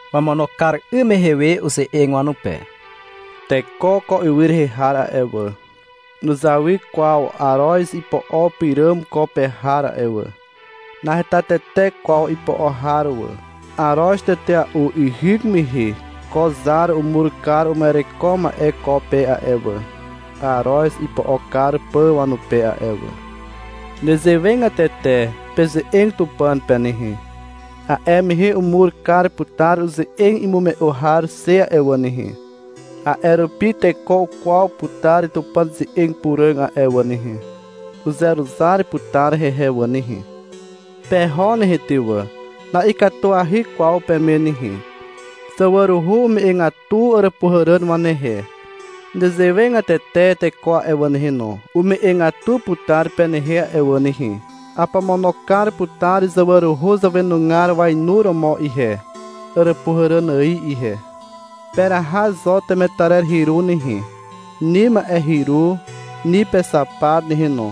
Wamono kar 'ym mehe we uze'eg wanupe. — Teko ko ywy rehe har a'e wà, nuzawy kwaw aroz ipo'o pyràm ko pe har a'e wà. Naheta tete kwaw ipo'o har wà. Aroz tetea'u ihyk mehe ko zar umur kar uma'ereko ma'e ko pe a'e wà, aroz ipo'o kar pà wanupe a'e wà. Nezewegatete peze'eg Tupàn pe nehe. A'e mehe umur kar putar uze'eg imume'u har xe a'e wà nehe. A'e rupi teko ukwaw putar Tupàn ze'eg puràg a'e wà nehe. Uzeruzar putar hehe wà nehe. Peho nehe ty wà. Na'ikatuahy kwaw peme nehe. Zawaruhu ume'egatu àràpuhàràn wanehe. Nezewegatete teko a'e wà nehe, ume'egatu putar penehe a'e wà nehe. Apomono kar putar zawaruhu zàwenugar wainuromo ihe, àràpuhàràn ài ihe. Peraha zo temetarer hyru nehe, ni ma'e hyru, ni pexapat nehe no.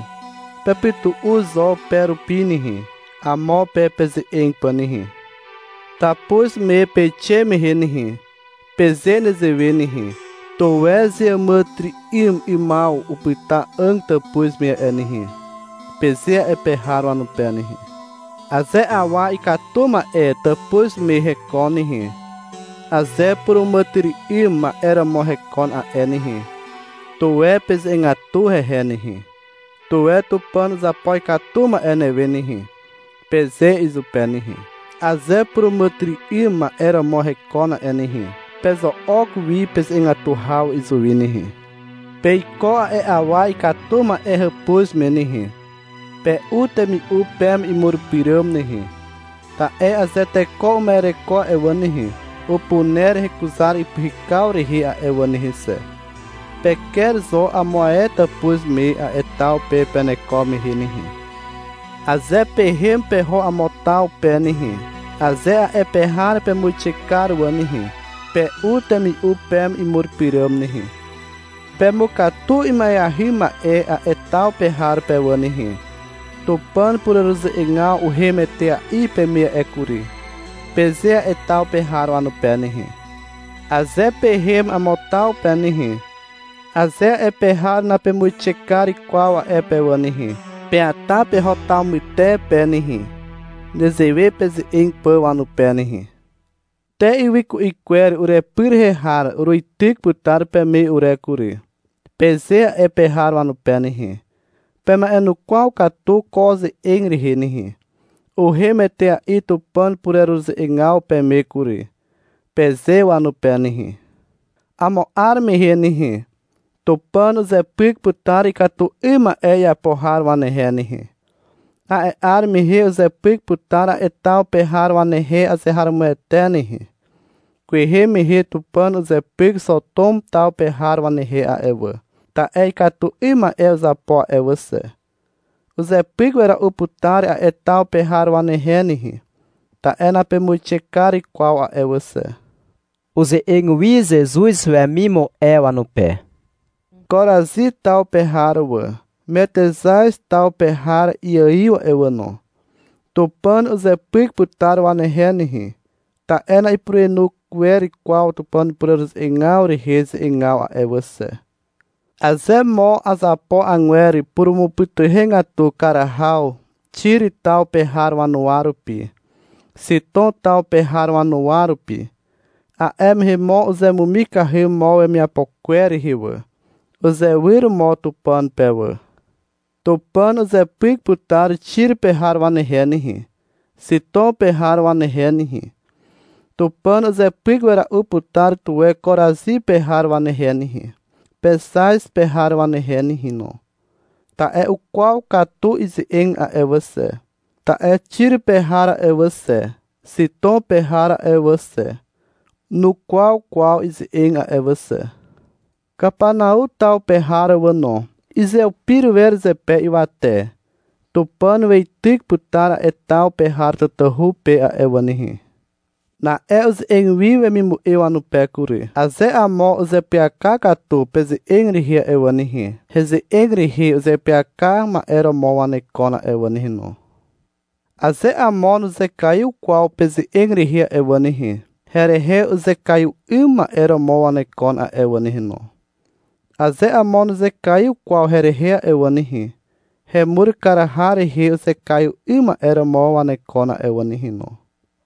Pepytu'u zo pe rupi nehe, amo pe peze'eg pà nehe. Tàpuz me peixe mehe nehe, peze nezewe nehe. — Tuwe zeàmàtyry'ym 'ymaw upyta 'àg tàpuz me a'e nehe, peze a'e pe har wanupe nehe. Aze awa ikatu ma'e tàpuz me hekon nehe, aze puràmàtyry'ym 'ym ma'e romo hekon a'e nehe, tuwe peze'egatu hehe nehe. — Tuwe Tupàn uzapo ikatu ma'e newe nehe, peze izupe nehe. Aze puràmàtyry'ym ma'e romo hekon a'e nehe, pezo'ok wi peze'egatu haw izuwi nehe. Peiko a'e awa ikatu ma'e hàpuz me nehe, pe'u temi'u peme imur pyràm nehe, ta'e aze teko uma'ereko a'e wà nehe, upuner hekuzar ipyhykaw rehe a'e wà nehe xe. Peker zo amo ae tàpuz me a'e taw pe peneko mehe nehe. Aze pehem peho amo taw pe nehe, aze a'e pe har pemuixe kar wà nehe, pe'u temi'u peme imur pyràm nehe. Pemukatu ima'eahy ma'e a'e taw pe har pe wà nehe. — Tupàn pureruze'egaw uhem etea'i peme a'e kury, peze a'e taw pe har wanupe nehe. Aze pehem amo taw pe nehe, aze a'e pe har napemuixe kar kwaw a'e pe wà nehe, peata peho taw mytepe nehe, nezewe peze'eg pà wanupe nehe. — Te ywy ku'i kwer urepy pe har uruityk putar peme ure kury, peze a'e pe har wanupe nehe. Pema'enukwaw katu ko ze'eg rehe nehe. — Uhem etea'i Tupàn pureruze'egaw peme kury, peze wanupe nehe. Amo 'ar mehe nehe, Tupàn uzepyk putar ikatu 'ym ma'e iapo har wanehe nehe. A'e 'ar mehe uzepyk putar a'e taw pe har wanehe azeharomoete nehe. Kwehe mehe Tupàn uzepyk Xotom taw pe har wanehe a'e wà, ta'e ikatu 'ym ma'e uzapo a'e wà xe. Uzepyk wera'u putar a'e taw pe har wanehe nehe, ta'e napemuixe kar kwaw a'e wà xe. Uze'eg wi Zezuz wemimu'e wanupe. — Korazi taw pe har wà. Metexaz taw pe har iaiw a'e wà no. Tupàn uzepyk putar wanehe nehe, ta'e na'ipurenu wer kwaw Tupàn pureruze'egaw rehe ze'egaw a'e wà xe. Aze mo azapo agwer purumupytuhegatu kar haw Xir taw pe har wanuwa rupi, Xitom taw pe har wanuwa rupi, a'e mehe mo uzemumikahy mo wemiapo kwer rehe wà, uzewyr mo Tupàn pe wà. Tupàn uzepyk putar Xir pe har wanehe nehe, Xitom pe har wanehe nehe. Tupàn uzepyk wera'u putar tuwe Korazi pe har wanehe nehe, Pexaz pe har wanehe nehe no, ta'e ukwaw katu ize'eg a'e wà xe. Ta'e Xiro pe har a'e wà xe, Xitom pe har a'e wà xe, nukwaw kwaw ize'eg a'e wà xe. Kapanau taw pe har wà no. Izeupir wer zepe ywate. Tupàn weityk putar a'e taw pe har tatahu pe a'e wà nehe. Na'e uze'eg wi wemimu'e wanupe kury. — Aze amo uzeapyaka katu peze'eg rehe a'e wà nehe, heze'eg rehe uzeapyaka ma'e romo wanekon a'e wà nehe no. Aze amo nuzekaiw kwaw peze'eg rehe a'e wà nehe, herehe uzekaiw 'ym ma'e romo wanekon a'e wà nehe no. Aze amo nuzekaiw kwaw herehe a'e wà nehe, hemur kar har rehe uzekaiw 'ym ma'e romo wanekon a'e wà nehe no.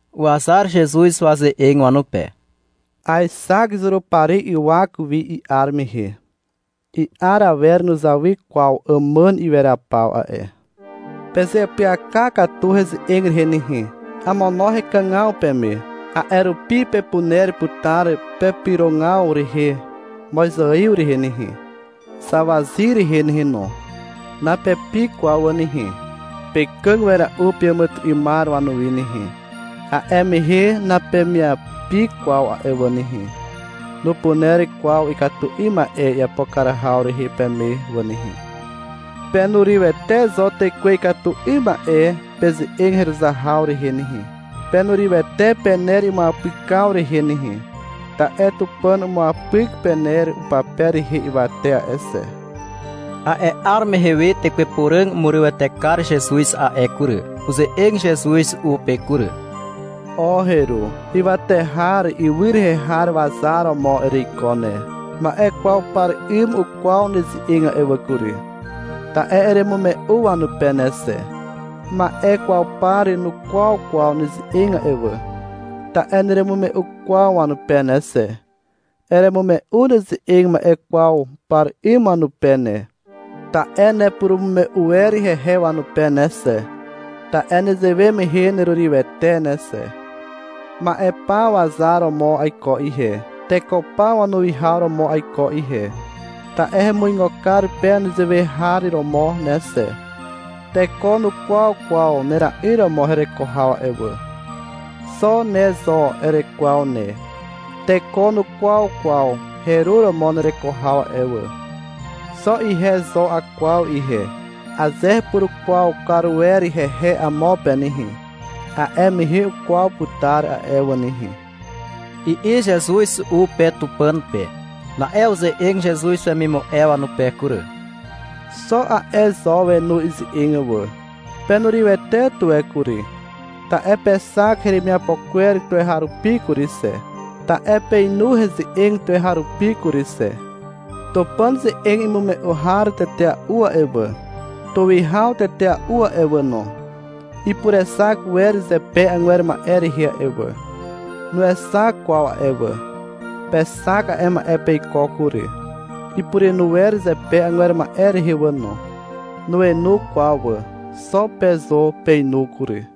Uwazar Zezuz waze'eg wanupe. — Aexak Zurupari ywak wi i'ar mehe. I'ar awer nuzawy kwaw àmàn iweraw paw a'e. Pezeapyaka katu heze'eg rehe nehe, amono hekàgaw peme. A'e rupi pepuner putar pepyrogaw rehe mozaiw rehe nehe, zawazyr rehe nehe no. Napepi kwaw wà nehe. Pekàg wera'u peàmàtyry'ymar wanuwi nehe. A'e mehe napemyapi kwaw a'e wà nehe. Nupuner kwaw ikatu 'ym ma'e iapo kar haw rehe peme wà nehe. Penurywete zo tekwe ikatu 'ym ma'e peze'eg heruzar haw rehe nehe. Penurywete pener imuapykaw rehe nehe, ta'e Tupàn umuapyk pener upape rehe ywate a'e xe. A'e 'ar mehe we Tekwe Puràg umurywete kar Zezuz a'e kury. Uze'eg Zezuz u pe kury. — O heru, ywate har ywy rehe har wazar romo ereiko ne. Ma'e kwaw par 'ym ukwaw neze'eg a'e wà kury, ta'e eremume'u wanupe ne xe. Ma'e kwaw par nukwaw kwaw neze'eg a'e wà, ta'e neremume'u kwaw wanupe ne xe. Eremume'u neze'eg ma'e kwaw par 'ym wanupe ne, ta'e nepurumume'u wer hehe wanupe ne xe, ta'e nezewe mehe nerurywete ne xe. Ma'e paw wazar romo aiko ihe, teko paw wanuwihaw romo aiko ihe, ta'e hemuigo kar pe nezewe har romo ne xe. Teko nukwaw kwaw nera'yr romo hereko haw a'e wà. Xo ne zo erekwaw ne. Teko nukwaw kwaw heru romo nereko haw a'e wà. Xo ihe zo akwaw ihe. Aze hepurukwaw kar wer hehe amo pe nehe, a'e mehe ukwaw putar a'e wà nehe, i'i Zezuz u pe Tupàn pe. Na'e uze'eg Zezuz wemimu'e wanupe kury. Xo a'e zo wenu ize'eg wà. — Penurywete tuwe kury, ta'e pexak heremiapo kwer tuweharupi kury xe, ta'e peinu heze'eg tuweharupi kury xe. Tupàn ze'eg imume'u har tetea'u a'e wà, tuwihaw tetea'u a'e wà no, ipurexak wer zepe agwer ma'e rehe a'e wà. Nuexak kwaw a'e wà. Pexak a'e ma'e peiko kury. Ipurenu wer zepe agwer ma'e rehe wà no. Nuenu kwaw wà. Xo pe zo peinu kury.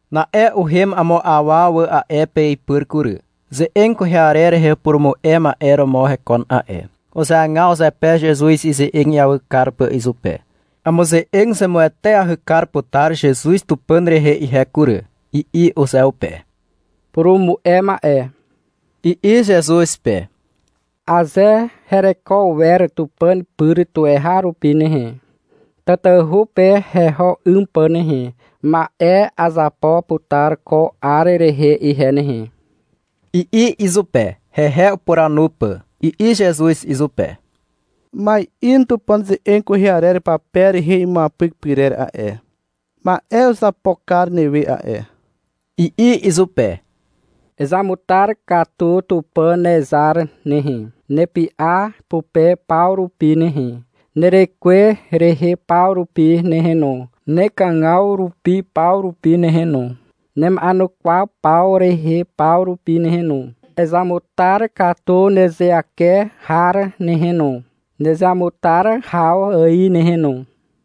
Na'e uhem amo awa wà a'e pe ipyr kury. Ze'eg kwehe arer rehe upurumu'e ma'e romo hekon a'e. Uzeagaw zepe Zezuz ize'eg iawy kar pà izupe. (Amuze'eg zemueteahy kar putar Zezuz Tupàn rehe ihe kury, i'i uzeupe.) — Purumu'e ma'e, i'i Zezuz pe. — Aze hereko wer Tupàn pyr tuweharupi nehe, tatahu pe heho 'ym pà nehe, ma'e azapo putar ko 'ar rehe ihe nehe, i'i izupe, hehe upuranu pà. I'i Zezuz izupe. — Ma'in Tupàn ze'eg kwehe arer pape rehe imuapyk pyrer a'e, ma'e uzapo kar newe a'e, i'i izupe. — Ezamutar katu Tupàn nezar nehe, nepy'a pupe paw rupi nehe, nerekwe rehe paw rupi nehe no, nekàgaw rupi paw rupi nehe no, nema'enukwaw paw rehe paw rupi nehe no. Ezamutar katu nezeake har nehe no, nezeamutar haw ài nehe no.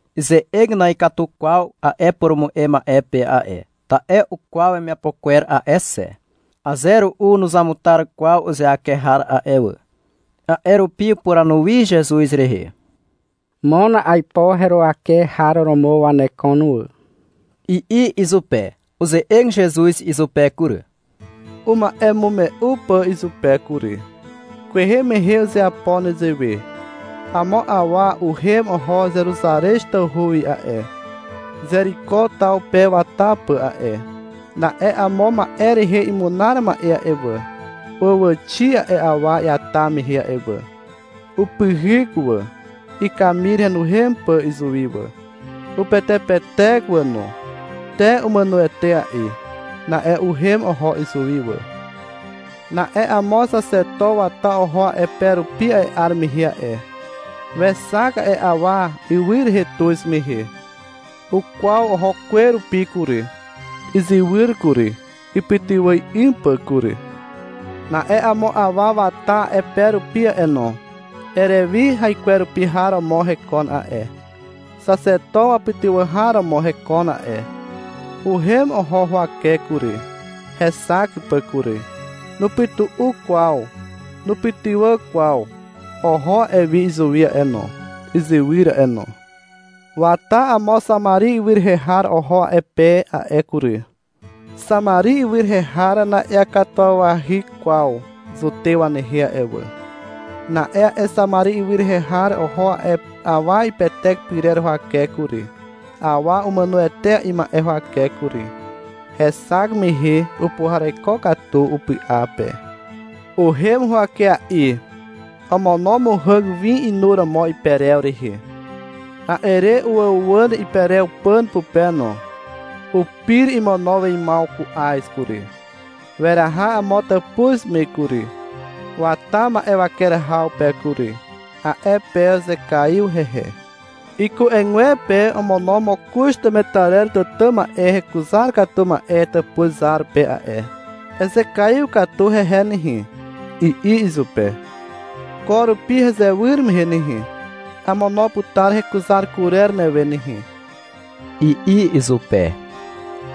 Ize'eg na'ikatu kwaw a'e purumu'e ma'e pe a'e, ta'e ukwaw wemiapo kwer a'e xe. (Aze ru'u nuzamutar kwaw uzeake har a'e wà.) A'e rupi upuranu wi Zezuz rehe. — Mon aipo heruwake har romo wanekon wà, i'i izupe. Uze'eg Zezuz izupe kury, uma'emume'u pà izupe kury. — Kwehe mehe uzeapo nezewe. Amo awa uhem oho Zeruzarez tawhu wi a'e, Zeriko taw pe wata pà a'e. Na'e amo ma'e rehe imunar ma'e a'e wà, uwàxi a'e awa iata mehe a'e wà. Upyhyk wà, ikamir henuhem pà izuwi wà. Upetepetek wà no. Te umàno etea'i. Na'e uhem oho izuwi wà. Na'e amo xaxeto wata oho a'e pe rupi a'e 'ar mehe a'e. Wexak a'e awa ywy rehe tuz mehe. Ukwaw oho kwe rupi kury, izywyr kury, ipytywà 'ym pà kury. Na'e amo awa wata a'e pe rupi a'e no. Erewi haikwerupi har romo hekon a'e, xaxeto wapytywà har romo hekon a'e. Uhem oho huwake kury, hexak pà kury. Nupytu'u kwaw. Nupytywà kwaw. Oho a'e wi izuwi a'e no, izywyr a'e no. Wata amo Xamari ywy rehe har oho a'e pe a'e kury. (Xamari ywy rehe har na'iakatuwawahy kwaw Zutew wanehe a'e wà.) Na'e a'e Xamari ywy rehe har oho a'e awa ipetek pyrer huwake kury, awa umàno etea'i ma'e huwake kury. Hexak mehe upuhareko katu upy'a pe. Uhem huwakea'i. Omono muhàg win inuromo iperew rehe. A'e re uwàuwàn iperew pàn pupe no. Upir imono weimaw ku'az kury. Weraha amo tàpuz me kury, wata ma'e waker haw pe kury. A'e pe uzekaiw hehe. Iku'egwepe omono mokoz temetarer tàtà ma'e hekuzar katu ma'e tàpuz zar pe a'e. — Ezekaiw katu hehe nehe, i'i izupe. — Ko rupi hezewyr mehe nehe, amono putar hekuzar kurer newe nehe, i'i izupe.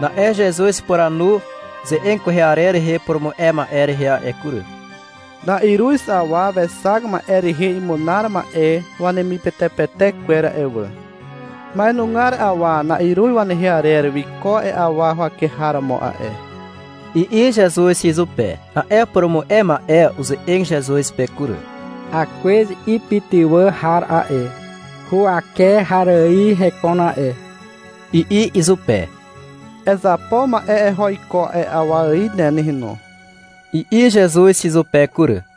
Na'e Zezuz upuranu ze'eg kwehe arer rehe upurumu'e ma'e rehe a'e kury. — Na'iruz awa wexak ma'e rehe imunar ma'e wanemipetepetek kwer a'e wà. Ma'enugar awa na'iruz wanehe arer wiko a'e awa huwake har romo a'e, i'i Zezuz izupe. A'e purumu'e ma'e uze'eg Zezuz pe kury. — Akwez ipytywà har a'e, huwake har ài hekon a'e, i'i izupe. — Ezapo ma'e eho iko a'e awa ài ne nehe no, i'i Zezuz izupe kury.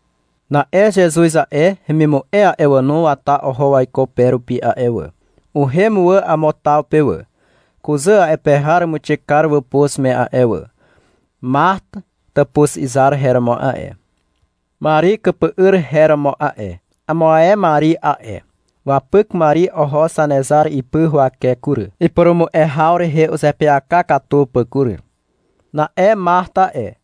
Na'e Zezuz a'e, hemimu'e a'e wà no, wata oho waiko pe rupi a'e wà. Uhem wà amo taw pe wà. Kuzà a'e pe har umuixe kar wàpuz me a'e wà. Mart tàpuz izar her romo a'e. Mari ikypy'yr her romo a'e. (Amo ae Mari a'e.) Wapyk Mari oho Zanezar ipy huwake kury, ipurumu'e haw rehe uzeapyaka katu pà kury. Na'e Mart a'e,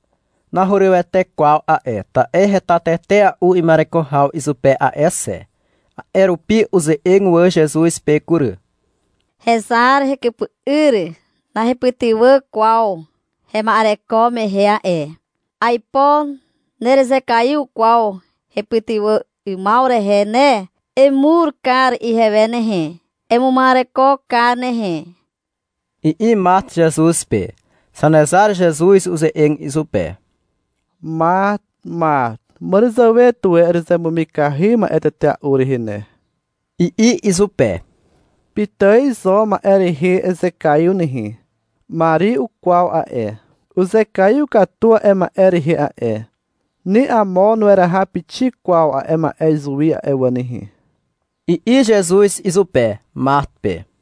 nahurywete kwaw a'e, ta'e heta tetea'u ima'ereko haw izupe a'e xe. A'e rupi uze'eg wà Zezuz pe kury. — Hezar, hekypy'yr nahepytywà kwaw hema'ereko mehe a'e. Aipo nerezekaiw kwaw hepytywà 'ymaw rehe ne. Emur kar ihewe nehe. Emuma'ereko kar nehe, i'i Mart Zezuz pe. Zanezar Zezuz uze'eg izupe. — Mart, Mart, màràzàwe tuwe erezemumikahy ma'e tetea'u rehe ne, i'i izupe. — Pitài zo ma'e rehe ezekaiw nehe. Mari ukwaw a'e. Uzekaiw katu a'e ma'e rehe a'e. Ni amo nueraha pixik kwaw a'e ma'e izuwi a'e wà nehe, i'i Zezuz izupe, Mart pe.